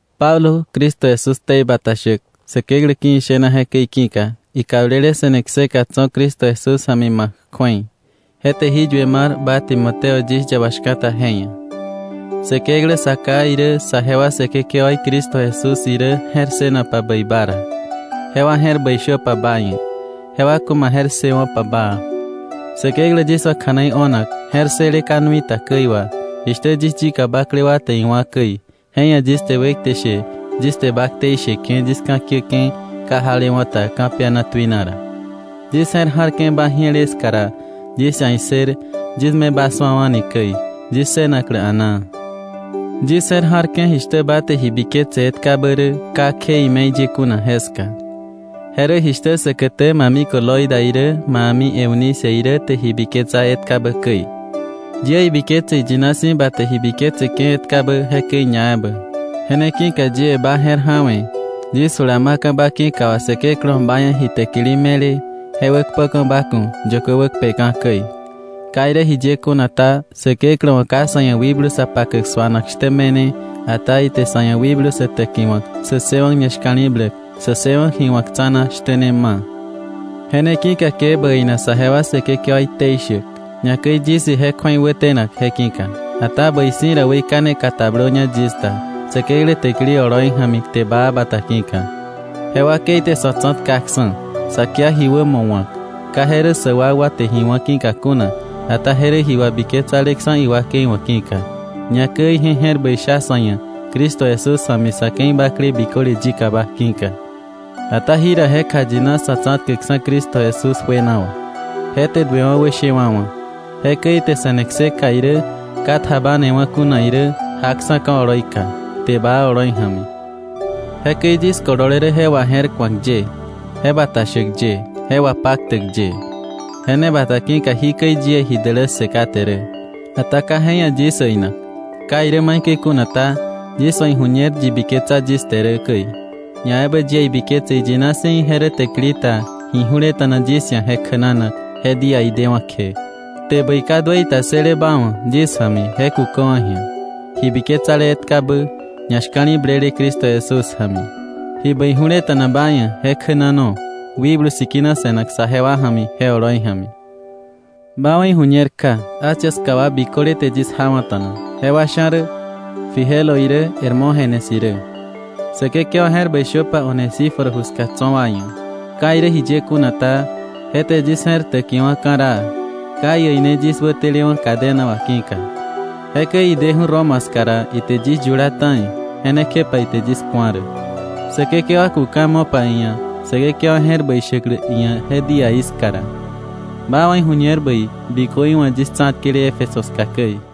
Pablo, Cristo Jesús ktei bata shäk Säkeklä ki̱ ishena jekäi ki̱ka, ikablele se̱ne kseka tso̱ Cristo Jesús ja̱mi ma̱k kju̱ei. Je te jí yue mar ba Timoteo yis yaba shka̱ta je ia̱. Säkeklä Sa Ká irä, saje wa Säkekewaí Cristo Jesús irä je̱r ssënopa bäi ba ra, jewa je̱r bäi shöpa ba ia̱, jewa ku̱ ma je̱r ssëwo̱pa baa. Säkeklä yis wa̱ kja̱nei o̱nak je̱r ssële ka nui ta käi wà, jishtä yis yika bakle wa te iwá̱ käi, je ia̱ yis te wekte she yis te ba ktei sheke̱ yis ka̱kiäke̱ ka jalewa̱ ta ka̱piana tuina ra. Yis je̱r ja̱rke̱ ba ji̱ele ska ra, yis ia̱ issër yis me ba su̱awa̱ni käi, yis ssënaklä a̱naa. Yis je̱r ja̱rke̱ jishtä ba te ji biketse etkabä rä ka kje ime̱i ye kuna jeska. Je rä jishtä säkätä ma mikö Loida irä ma a̱mi Eunice irä te ji biketsa etkabä käi. Yie ibiketse iyina si̱ ba te ji biketseke̱ etkabä jekäi ñaebä. Je ne ki̱ka yie ba je̱r ja̱we̱ yis jula ma̱ka̱ ba ki̱ka wà Säkeklä wa̱ ba ia̱ ji täkili me̱le, je wäkpöka̱ ba ku̱ yökö wäkpeka̱ käi. Ka irä jiye kuna ta, Säkeklä wa̱ ka sa̱ ia̱ wikblu sa pakäk suanak shtä me̱ne, ata ite sa̱ ia̱ wikblu sä täkiwa̱k, sä ssëwa̱k ñashka̱li̱bläk, sä ssëwa̱k ji wa̱k tsa̱na shtä ne ma̱. Je ne ki̱ka ke bä äina saje wa Säkekewaí ktei shäk, ñakäi yis ije kju̱ei wätenak je ki̱ka. Ata bäi si̱ ra weikane katablöña yis da Säkeklä täkili oloi ja̱mi kte baa bata ki̱ka. Je wakei te sa̱ tsa̱tkaksa̱, sa kia ji wämo wa̱k, ka je rä sä wakwa te ji wá̱ ki̱ka kuna, ata je rä ji wabiketsaleksa̱ iwakei wa̱ ki̱ka, ñakäi ije je̱r bäi sha sa̱ ia̱ Cristo Jesús ja̱mi sa̱ ke̱i bakle biköle yikaba ki̱ka. Ata jira je kjayina Sa̱tsa̱tkäkksa̱ Cristo Jesús juena wà. Je te duewa̱ wäshewa̱wa̱. Jekäi ite se̱ne kseka irä ka tjabanewa̱ kuna irä jaksa̱ ka̱ oloika, kte baa oloi ja̱mi. Jekäi yis kolole rä je waje̱rku̱ak ye, je bata shäk ye, je wapaktäk ye. Je ne bata ki̱ka jikäi yie ji dälässë kate rä, ata ka je ia̱ yis äinak. Ka irä maikäi kuna ta, yis wa̱ iju̱ñer yi biketsa yis te rä käi. Ñaebä yie ibiketse iyina si̱ ije rä täkili ta ji ju̱leta̱na yis ia̱ je kjänanak je díaí dewa̱ kje. Kte bäi ka duëi ta ssële ba wa̱ yis ja̱mi je kuköwa̱ ji̱a, ji biketsale etkabä, ñashka̱li̱blele Cristo Jesús ja̱mi. Ji bäi ju̱leta̱na ba ia̱ je kjänano Wikblu Sikina se̱nak saje wa ja̱mi je oloi ja̱mi. Ba wa̱ iju̱ñer kja Asia ska wa biköle te yis jawa̱ta̱na, jewa sha̱ rä Figelo irä Hermógenes irä. Säkekewa je̱r bäi shöpa Onesíforo ju ska tso̱ wa ia̱. Ka irä jiye kuna ta, je te yis je̱r täkiwa̱ ka̱raa, ka iäine yis wätelewa̱ cadena wà ki̱ka. Jekäi ideju̱ Roma ska ra, ite yis yula ta̱i, je ne kjepa ite yis ku̱a rä. Säkekewa ku̱ ka̱ mo̱pa iia̱ Säkekewa je̱r bäi shäklä iia̱ je díaí ska ra. Ba wa̱ iju̱ñer bäi bikö iwa̱ yis tsa̱tkele Éfeso ska käi.